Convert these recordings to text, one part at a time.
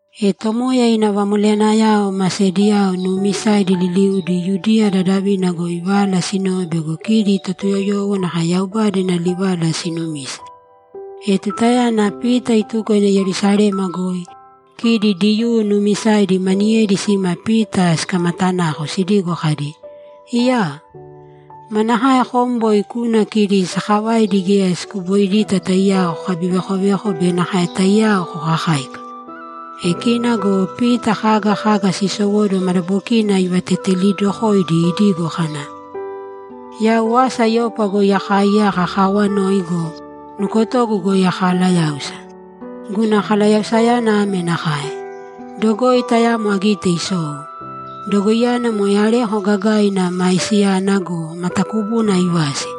E Tomoya ina vamoleyanayao ma sediyao nuumisaidi liliudi Yudiya dadavina goi vala sinove bego kidi Totuyoyowo nakae Yaubada ina livala sinumise. E tutayana Pita ituko ina Yerusalema goi, kidi Diyuu nuumisaidi maniyedi sima Pita sikamatanako sidigo kadi, ‘Iyaa! Manakae kom boi kuna kidi sakavaidi geya sikupoidita taiyao kokabivekoveko be nakae taiyao kokakáika?’ E kina go Pita kaga kaga sisowóduwo madabokina ivatetelidokoidi idigo kana, ‘Yau asa Yopa goi akaaiyaka akaawanoi go, nukotogu goi akalayáusa. Guna kalayausayana ame nakae: Dogoi tayamo agite isou. Dogoiyana moe areko gagaina maisiyana go, matakubuna aivasi.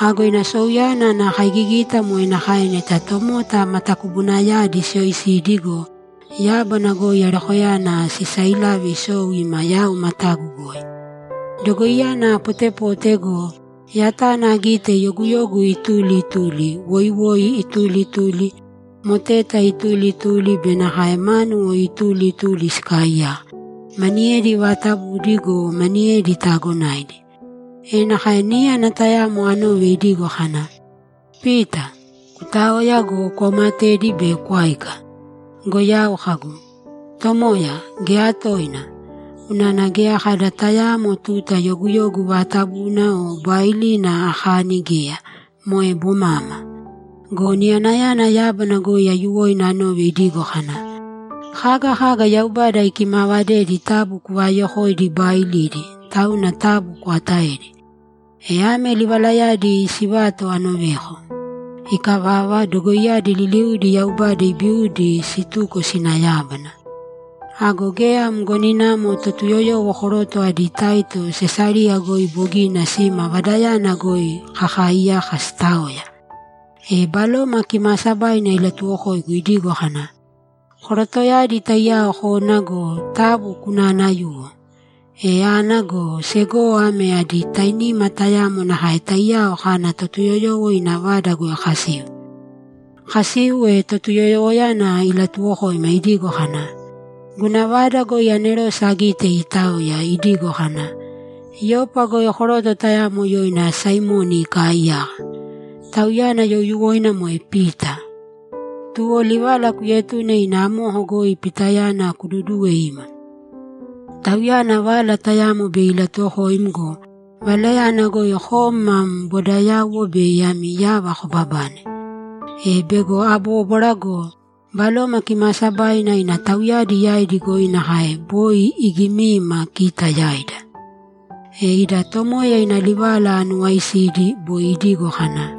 Ago ina souyana ana kaigigita moe nakae neta tomota matakubunayadi siyoisidi go, yábana goi arekoyana sisailave isou ima yau matagu goi. Dogoiyana apotepote go, yatana agite yoguyogu ituli ituli, woiwoi ituli ituli, moteta ituli ituli be nakae mánuwo ituli ituli sikaaiyaka, maniyedi vaatabudi go, maniyedi taagonaidi. E nakae níyana tayamo anove idigo kana, “Pita, kutāoya go, kwaumatēdi be kwāika!” Go yau kagu, “Tomoya, geya toina! Unana geya kada tayaamo tuta yoguyogu vaatabuna o baailina akani geya, moe bomama.” Go niyanayana yábana goi aiyuwoina anove idigo kana, “Kaga kaga Yaubada ikimaavadedi taabu kuvaayokōidi baailidi, tauna taabu kwaatāedi!” E ame livalayadi sivato anoveko. Ikavava, dogoiyadi liliudi Yaubada ibiudi situko sina yábana. Ago geya mgoninamo Totuyoyowo koroto adi taito Sesariya goi bogina sima vadayana goi kakaaiyaka siitaoya. E Baloma Kimaasabaina ilatuwokoigu idigo kana, “Korotoyadi taiyao kōna go, taabu kunaanayūwo.” E ana go, segowo ame adi tainima tayamo nakae taiyao kana Totuyoyowo ina vada goi kasiu. Kasiu, e Totuyoyowoyana ilatuwokoima idigo kana, “Guna vada goi anerose agite iitaoya, idigo kana, ‘Yopa goi koroto tayamo yoina Saimoni ikaaiyaka. Tauyana youyuwoina moe Pita. Tuwo livala kuetūne ina amoko goi Pitayana kududūwe ima. Tauyana vala tayamo bei ilatuwokoim go, valayana goi kom mam bodayauwo bei ami yava kobabane.’” E, bego abóbwara go, Baloma Kimaasabaina ina tauyadi yaidi goi nakae boi igimiima kita yaida! E ida Tomoya ina livala anuwaisidi; boi idigo kana,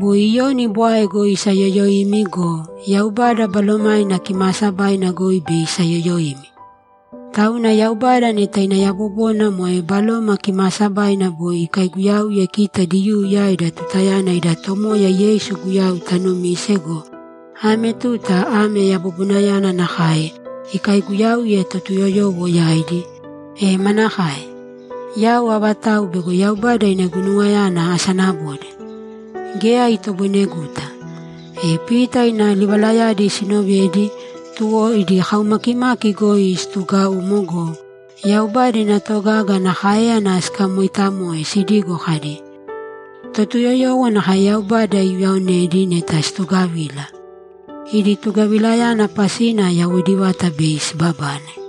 “Boi Iyoni bwae goi isayoyoimi go, Yaubada Balomaina Kimaasabaina goi bei isayoyoimi.” Tauna Yaubada neta ina yabobona moe Baloma Kimaasabaina boi ikaiguyauye kita Diyuu yaida tutayana ida Tomoya Yeisu Guyau tanumise go, ame tuta ame yabobonayana nakae ikaiguyauye Totuyoyowo yaidi, e manakae? Yau avatau bego Yaubada ina guinuwayana asanabode? Geya itoboineguta.’ E Pita ina livalayadi sinovedi, tuwo idi kaumakimaki goi situgaumo go, Yaubada ina togaga ana káeyana sikamoitamoe sidigo kadi, ‘Totuyoyowo nakae Yaubada iuyaonedi neta situgavila. Idi tugavilayana pasina yawoidi vata bei sibabane!’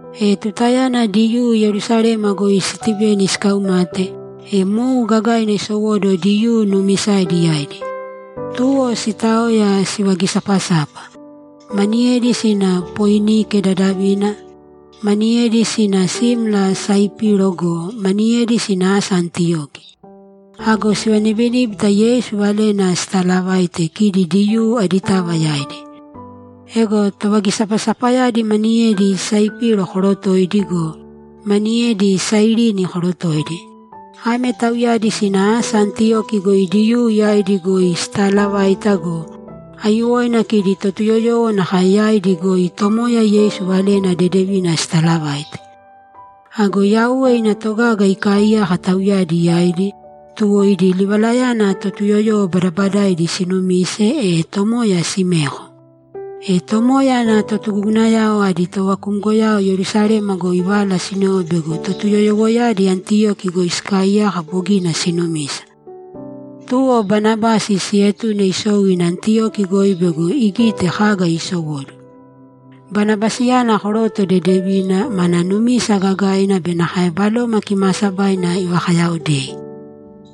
E tutayana Diyuu Yerusalema goi Stiveni sikaumate, e mou gagaina isowóduwo Diyuu nuumisaidi yaidi. Tuwo sitaoya, sivagisapasapa; maniyedi sina Poinike dadavina, maniyedi sina simla Saipiro go, maniyedi sina asa Antiyoki. Ago sivanibiníbita Yeisu valena sitaalavaite kidi Diyuu aditava yaidi. Ego tovagisapasapayadi maniyedi Saipiro korotoidi go, maniyedi Sairini korotoidi. Ame tauyadi sina asa Antiyoki goi Diyuu yaidi goi sitaalavaita go, aiyuwoina kidi Totuyoyowo nakae yaidi goi Tomoya Yeisu Valena Dedevina sitaalavaite. Ago Yauwe ina togaga ikaaiyaka tauyadi yaidi, tuwo idi livalayana Totuyoyowo badabadaidi sinumise, e Tomoya simeko. E Tomoya ana totugugunayao adi tovakumgoyao Yerusalema goi vala sinove bego Totuyoyowoyadi Antiyoki goi sikaaiyaka bogina sinumisa. Tuwo Banabasi sietune isou ina Antiyoki goi bego igite kaga isowóduwo. Banabasiyana koroto dedevina, mana numisa gagaina be nakae Baloma Kimaasabaina ivakayaaodei.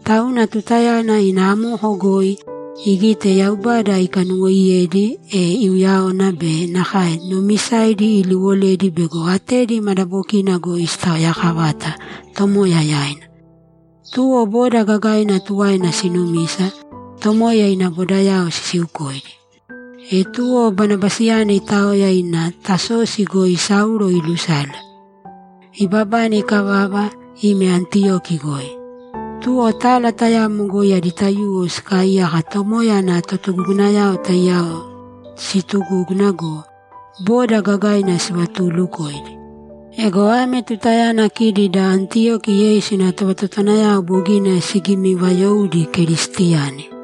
Tauna tutayana ina amoko goi, igite Yaubada ikanuwoiyedi, e iuyáwana be nakae tonumisayadi iliwoledi bego atedi madabokina goi sitaoyakavata Tomoya yaina. Tuwo boda gagaina tuwaina sinumisa, Tomoya ina bodao sisiukoidi. E tuwo Banabasiyana itaoya ina Tasosi goi Saulo ilusale. Ibabane ikavava, ime Antiyoki goi. Tuwo tala tayamo goi adi taiyuwo sikaaiyaka Tomoya ana totugugunayao taiyao situgúguna go, boda gagaina sivatuulukoidi. Ego ame tutayana kidi da Antiyoki Yeisu ina tovatotowanayao bogina sigimivayoudi Keristiyani.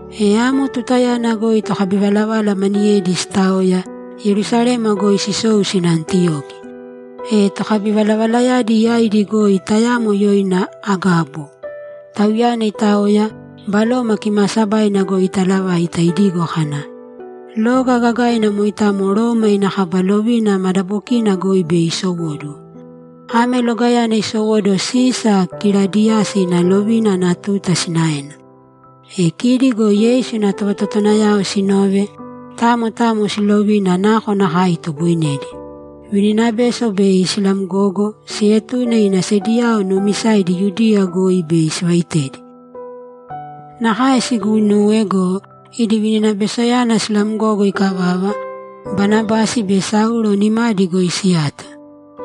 E amo tutayana goi tokabivalavala maniyedi sitaoya, Yerusalema goi sisou sina Antiyoki. E tokabivalavalayadi yaidi goi tayamo yoina Agabo. Tauyana itaoya, Baloma Kimaasabaina goi itaalavaita idigo kana, ‘Loga gagaina moitamo Roma ina kaba lovina madabokina goi bei isowóduwo.’ Ame logayana isowóduwo Sisa Kiladiyasi ina lovina ana tuta sinaena. E kidi go Yeisu ina tovatotowanayao sinove, tamo tamo silovina nakonakae itoboinedi, vininabeso bei silamgogo, sietune ina sediyao nuumisaidi Yudiya goi bei sivaitedi. Nakae siguinuwe go, idi vininabesoyana silamgogo ikavava, Banabasi be Saulo nimadi goi siyato.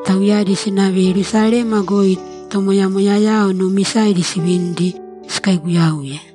Tauyadi sinave Yerusalema goi tomoyamoyayao nuumisaidi sivinidi, sikaiguyauye.